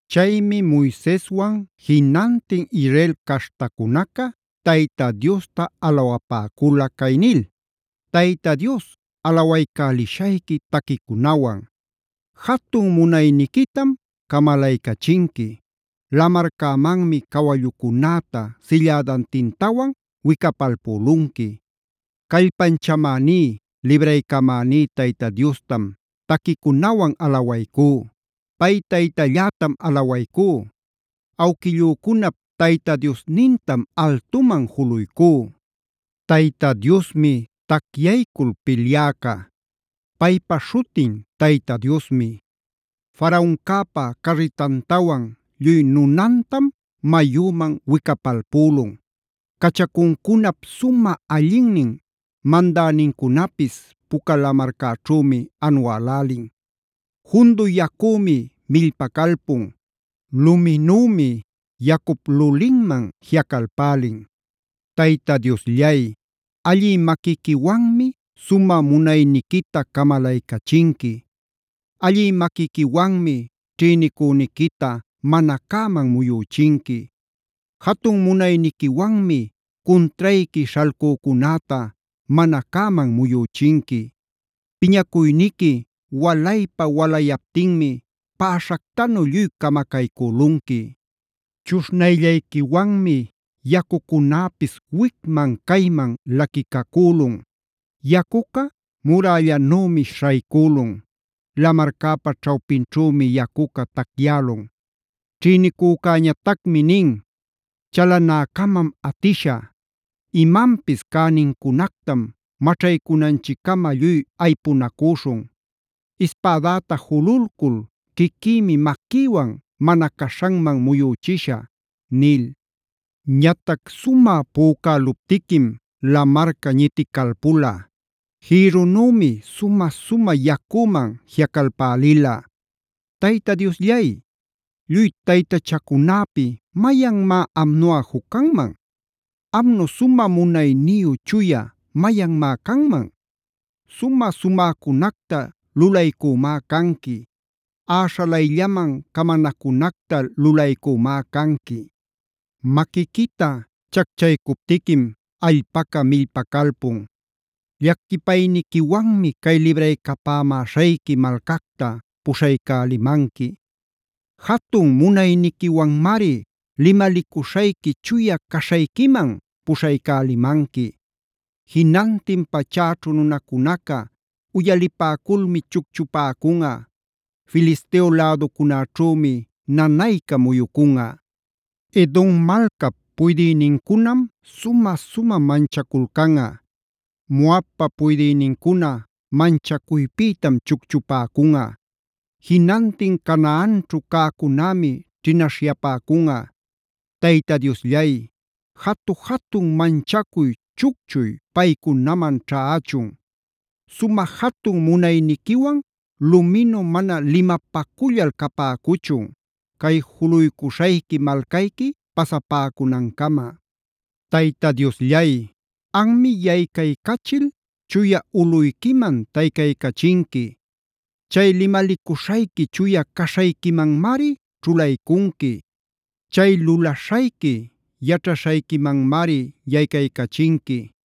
Chaymi Moiseswan jinantin Israel caśhtacunaca Tayta Diosta alawapäcula cay nil: “Tayta Dios alawaycälishayqui taquicunawan;a jatun munayniquitam camalaycachinqui; lamarcämanmi cawallucunäta sillädantintawan wicapalpülunqui. Callpanchamäní, libraycamäníb Tayta Diostam taquicunawan alawaycú. Pay Taytallätam alawaycú. Awquillücunap Tayta Diosnintam altuman juluycú. Tayta Diosmi tacyaycul pilyäca. Paypa śhutin Tayta Diosmi. Faraoncäpa carritantawan, lluy nunantam mayüman wicapalpülun. Cachacuncunap sumä allinnin mandänincunapis Puca Lamarcäćhümi anuälälin. Jundu yacümi millpacalpun; luminümi yacup lulinman jiꞌacalpälin. Tayta Diosllay, allï maquiquiwanmi sumä munayniquita camalaycachinqui; allï maquiquiwanmi ćhïnicüniquita mana cäman muyüchinqui. Jatun munayniquiwanmi cuntrayqui śhalcücunäta mana cäman muyüchinqui. Piñacuyniqui walaypa-walayaptinmi päśhactanu lluy camacaycülunqui. Chuśhnayllayquiwanmi yacucunäpis wicman cayman laquicacülun. Yacuca murällanümi śhaycülun; lamarcäpa ćhawpinćhümi yacuca tacyälun. “Ćhïnicücäñatacmi nin: ‘Chalanäcamam atishä; imanpis cänincunactam maćhaycunanchiccama lluy aypunacüśhun. Ispädäta jululcul quiquïmi maquïwan mana caśhanman muyüchishä’ nil. Ñatac sumä pücäluptiquim lamarca ñiticalpula. Jïrrunümi sumä-sumä yacüman jiꞌacalpälila. ¿Tayta Diosllay, lluy taytachacunäpi mayanmá amnuꞌa juc canman? ¿Amnu sumä munayniyu chuya mayanmá canman? Sumä-sumäcunacta lulaycümá canqui; äśhalayllaman camanacunacta lulaycümá canqui. Maquiquita chacchaycuptiquim allpaca millpacalpun. Llaquipayniquiwanmi cay libraycapämäśhayqui malcacta puśhaycälimanqui. Jatun munayniquiwanmari limalicuśhayqui chuya caśhayquiman puśhaycälimanqui. Jinantin pachäćhu nunacunaca uyalipäculmi chucchupäcunꞌa; Filisteo läducunaćhümi nanayca muyucunꞌa. Edom malcap puydïnincunam sumä-sumä manchaculcanꞌa. Moabpa puydïnincuna manchacuypïtam chucchupäcunꞌa. Jinantin Canaanćhu cäcunämi ćhinaśhyapäcunꞌa. Tayta Diosllay, jatu-jatun manchacuy, chucchuy paycunaman ćhächun. Sumä jatun munayniquiwan luminu mana limapacullal capäcuchun, cay juluycuśhayqui malcayqui pasapäcunancama; Tayta Diosllay, anmi yaycaycachil chuya ulꞌuyquiman taycaycachinqui. Chay limalicuśhayqui chuya caśhayquimanmari ćhulaycunqui. Chay lulaśhayqui yaćhaśhayquimanmari yaycaycachinqui.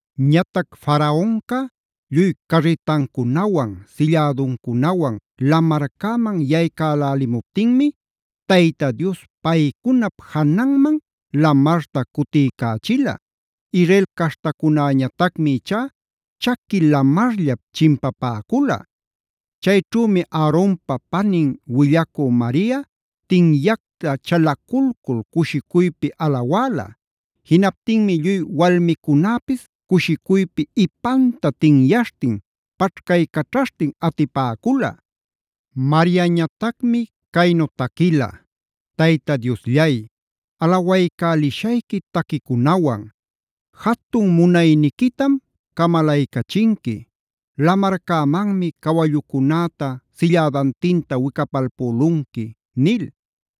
Ñatac Faraonca lluy carritancunawan, sillädancunawan lamarcäman yaycälälimuptinmi Tayta Dios paycunap jananman lamarta cutiycächila. Israel caśhtacunäñatacmi ichá chaqui lamarllap chimpapäcula. Chayćhümi Aaronpa panin willacü Mariac tinyacta chalaculcul cushicuypi alawäla. Jinaptinmi lluy walmicunäpis cushicuypi ipanta tinyaśhtin paćhcaycaćhaśhtin atipäcula. Mariañatacmi caynu taquila: “Tayta Diosllay, alawaycälishayqui taquicunawan. Jatun munayniquitam camalaycachinqui; lamarcämanmi cawallucunäta sillädantinta wicapalpülunqui” nil.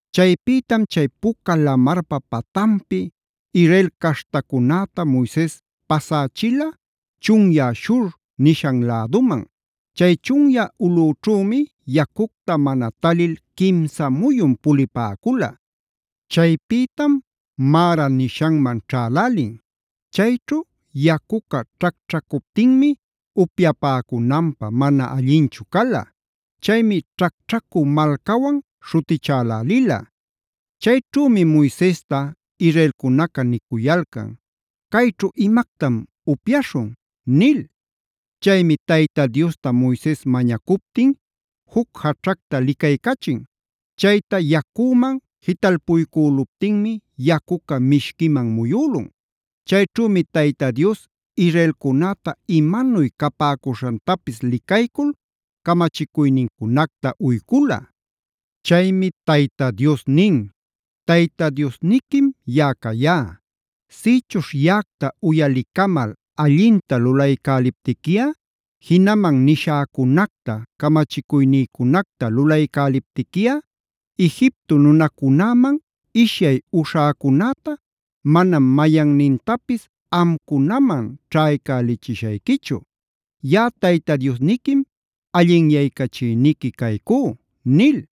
Chaypïtam chay Puca Lamarpa patanpi Israel caśhtacunäta Moises pasächila chunyä Shur nishan läduman. Chay chunyä ulꞌüćhümi yacucta mana talil quimsa muyun pulipäcula. Chaypïtam Marad nishanman ćhälälin. Chayćhu yacuca ćhacćhacuptinmi upyapäcunanpä mana allinchu cala. Chaymi ćhacćhacü malcawan śhutichälälila. Chayćhümi Moisesta israelcunaca nicuyalcan: “Cayćhu ¿imactam upyaśhun?” nil. Chaymi Tayta Diosta Moises mañacuptin juc jaćhacta licaycachin. Chayta yacüman jitalpuycüluptinmi yacuca mishquiman muyülun. Chayćhümi Tayta Dios israelcunäta imanuy capäcuśhantapis licaycul camachicuynincunacta uycula. Chaymi Tayta Dios nin: “Tayta Diosniquim yaꞌa cayá. Sïćhuśh yaꞌacta uyalicamal allinta lulaycäliptiquiꞌa, jinaman nishäcunacta, camachicuynïcunacta lulaycäliptiquiꞌa Egipto nunacunäman ishyay uśhäcunäta manam mayannintapis amcunaman ćhaycälichishayquichu. Yaꞌa Tayta Diosniquim allinyaycachïniqui caycú” nil.